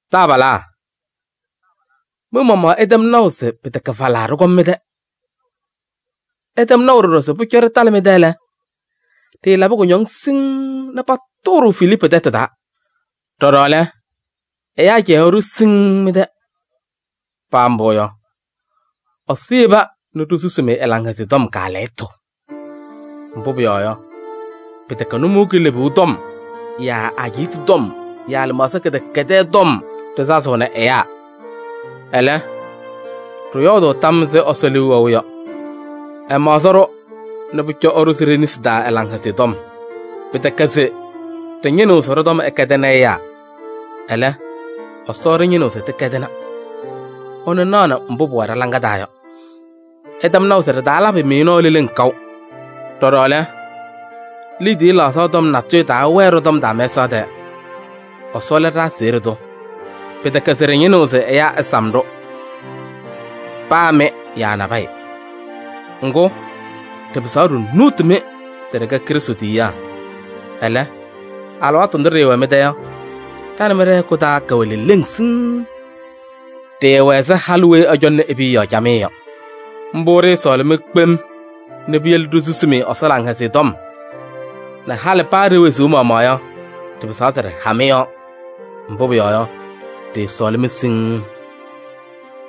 Taabalaa! Mɩ-maɣmaɣ ɩtɛm naʋ se pɩtɛkɛ falaa ɖɩkɔm mɩ-tɛ. Ɩtɛm naʋ ɖɔɖɔ se pʋcɔ ɖɩtalɩ mɩ-tɛ lɛ, ɖɩɩlabɩ kʋñɔŋ siŋŋ nɛ patʋʋ-ɖʋ Filiipu tɛtʋ taa. Ɖɔɖɔ lɛ, ɛyaa cɛyaɣ-ɖʋ siŋŋ mɩ-tɛ. Paa mbʋ yɔ, Ɛsɔ yeba nɛ ɖisusi-mɩ ɛ-Laŋhɛzɩyɛ Tɔm kaalɛyɩtʋ. Mbʋ pʋyɔɔ yɔ, pɩtɛkɛ nʋmɔʋ kilebuu tɔm yaa ajiitu tɔm yaa lɩmaɣza kɩdɛkɛdɛɛ tɔm ɖɩsazɩɣnɩ ɛyaa. Ɛlɛ, ɖɩyɔɔdʋʋ tam ɛzɩ Ɛsɔ liu wɛʋ yɔ: ɛmaɣzɩ-ɖʋ nɛ pʋcɔ ɛɖʋzɩ ɖe-nesi taa ɛ-Laŋhɛzɩyɛ Tɔm. Pɩtɛkɛ se ɖɩñɩnɩɣ se ɖɔ-tɔm ɛkɛdɩnɩ ɛyaa, ɛlɛ, Ɛsɔ ɖɩñɩnɩɣ se tɩkɛdɩna, ɛnʋ naɣnɩ mbʋ pʋwɛ ɖa-laŋa taa yɔ. Ɩtɛm naʋ se ɖɩtaalabɩ-mɩ nɔɔ leleŋ kaʋ. Ɖɔɖɔ lɛ, liidiye laɣzaɣ tɔm natʋyʋ taawɛɛ ɖɔ-tɔm taa mɛsaɣ tɛɛ. Ɛsɔ lɛ ɖa-aseɣɖe tʋ. Pɩtɛkɛ se ɖɩñɩnɩɣ se ɛyaa ɛsam-ɖʋ: paa mɩ yaa nabɛyɛ. Ŋgʋ, ɖɩpɩzaɣ ɖinuuti-mɩ se ɖɩkɛ Krɩstʋ tiyiyaa. Ɛlɛ, alɩwaatʋ ndʋ ɖɩɩwɛ mɩ-tɛ yɔ, ɖa nɛ mɩ ɖɛ-hɛkʋ taa kɛwɛ leleŋ siŋŋ. Ɖɩɩwɛ ɛzɩ halʋ weyi ɛcɔŋnɩ e-piya yɔɔ camɩyɛ yɔ. Mbʋ ɖɩɩsɔɔlɩ-mɩ kpem nɛ piyele ɖisusi-mɩ Ɛsɔ Laŋhɛzɩyɛ Tɔm nɛ halɩ paa ɖe-wezuu maɣmaɣ yɔ, ɖɩpɩzaɣ se ɖɩha mɩ-yɔɔ. Mbʋ pʋyɔɔ yɔ, ɖɩɩsɔɔlɩ-mɩ siŋŋ.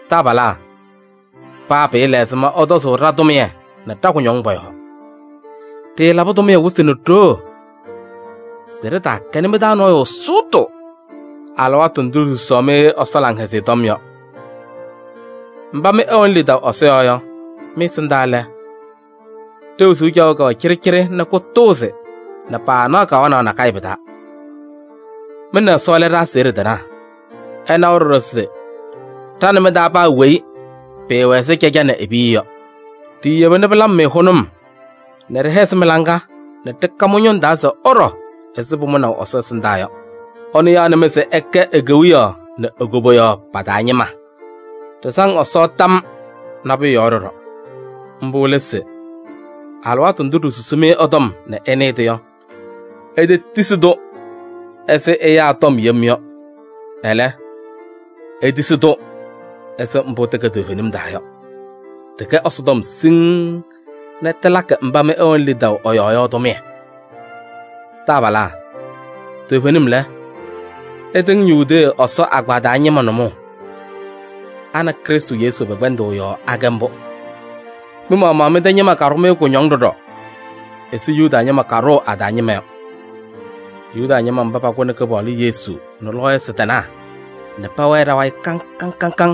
Taabalaa! Paa pɩɩla ɛzɩma ɩtɔzʋʋ ɖa-tʋmɩyɛ nɛ ɖa-kʋñɔŋ pɔ-yɔɔ: ɖɩɩlabɩ tʋmɩyɛ wɩsɩ nɛ ɖoo se ɖɩtaakɛnɩ mɩ-taa nɔɔyʋ sʋʋtʋ alɩwaatʋ ndʋ ɖisusaɣ-mɩ Ɛsɔ Laŋhɛzɩyɛ Tɔm yɔ. Mba mɩ ɩwɛnɩ lidaʋ Ɛsɔ yɔɔ yɔ, mɩ-ɛsɩndaa lɛ, ɖe-wezuu caɣʋ kɛwɛ cɩɖɩcɩɖɩ nɛ kʋtʋʋzɩ nɛ paanaɣ kawanaɣ nakɛyɛ pɩ-taa. Mɩ nɛ Ɛsɔ lɛ ɖa-aseɣɖe tɩnaa. Ɩnawa ɖɔɖɔ se ɖa nɛ mɩ-taa paa weyi pɩɩwɛ ɛzɩ caja nɛ e-piya yɔ. Ɖiiyeba pɩlabɩ-mɩ hʋnʋm nɛ ɖɩhɛzɩ mɩ-laŋa nɛ ɖɩka mɩ-ñʋŋ taa se ɩɖɔ ɛzɩ pʋmʋnaʋ Ɛsɔ ɛsɩndaa yɔ. Ɛnʋ yaɣnɩ-mɩ se ɩkɛ e-Kewiyaɣ nɛ e-koboyaɣ pa-taa ñɩma. Ɖɩsaŋ Ɛsɔ tam nabʋyʋ yɔɔ ɖɔɖɔ. Mbʋ lɛ se: alɩwaatʋ ndʋ ɖisusi-mɩ ɛ-tɔm nɛ ɩnɩɩ-tʋ yɔ, itetisi-tʋ ɛzɩ ɛyaa tɔm yem yɔ. Ɛlɛ, itisi-tʋ ɛzɩ mbʋ tɩkɛ toovenim taa yɔ, tɩkɛ Ɛsɔtɔm siŋŋ nɛ tɩlakɩ mba mɩ ɩwɛnɩ lidaʋ ɛ-yɔɔ yɔ tʋmɩyɛ. Taabalaa! Toovenim lɛ, ɩtɩŋ Yudee Ɛsɔ agbaa taa ñɩma nʋmɔʋ. A nɛ Krɩstʋ Yesu pɛ-kpɛndʋʋ yɔɔ akɛ mbʋ. Mɩ-maɣmaɣ mɩ-tɛ ñɩma ɖʋ-mɩ kʋñɔŋ ɖɔɖɔ ɛzɩ Yuda ñɩma kaaɖʋʋ a-taa ñɩma yɔ. Yuda ñɩma mba pakʋnɩ Kɩpaɣlʋ Yesu nɛ lɔɔyɩsɩ tɩnaa nɛ pɛwɛɛ ɖa-wayɩ kaŋ kaŋ.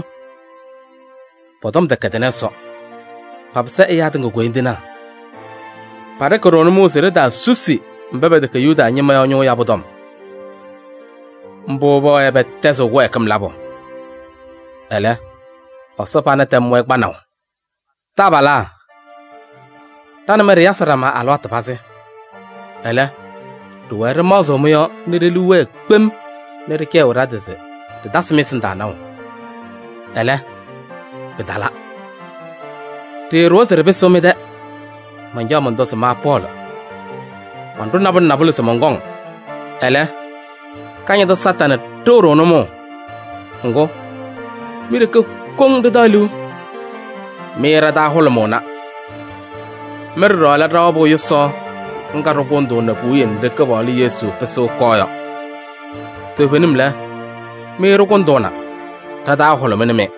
Pɔ-tɔm tɛkɛdɩnɩ Ɛsɔ, papɩsɩ ɛyaa tɩŋa koyindinaa. Paɖɩkɩ-ɖʋ nʋmɔʋ se ɖitaasusi mba pɛtɛkɛ Yuda ñɩma yɔ ñʋʋ yabʋ tɔm. Mbʋ pɛwɛɛ pɛtɛzɩɣ kɩwɛɛkɩm labʋ. Ɛlɛ, Ɛsɔ pana tɛmnɩ-wɛ kpanaʋ. Taabalaa! Ɖa nɛ mɩ ɖɩyasɩ ɖama alɩwaatʋ pazɩ. Ɛlɛ, ɖɩɩwɛɛ ɖɩmaɣzɩɣ mɩ-yɔɔ nɛ ɖe-liu wɛɛ kpem nɛ ɖɩcɛyɩ ɖa-tɩ se ɖɩtasɩ mɩ-ɛsɩndaa naʋ. Ɛlɛ, pɩtala. Ɖɩɩɖʋwa se ɖɩpɩsɩɣ mɩ-tɛ, mancaɣ mɔntɔ se ma Pɔɔlɩ, manɖʋ nabʋlɛ nabʋlɛ se mɔnkɔŋ, ɛlɛ, Kañadʋ Satanɩ ɖɩɣ-ɖʋ nʋmɔʋ. Ŋgʋ, mi-ɖeke koŋ ɖɩtaɣ liu, mɩ ɖa-taa hʋlʋmʋʋna. Mɩ ɖɔɖɔ lɛ ɖa-wabʋ yʋsaɣ ŋga ɖɩkʋndʋʋnɩ puwiye nɖɩ ɖa-Kɩpaɣlʋ Yesu pɩsɩɣ ɛkɔɔ yɔ. Toovenim lɛ, mɩ ɖɩkʋndʋʋna, ɖa-taa hʋlʋmɩnɩ-mɩ.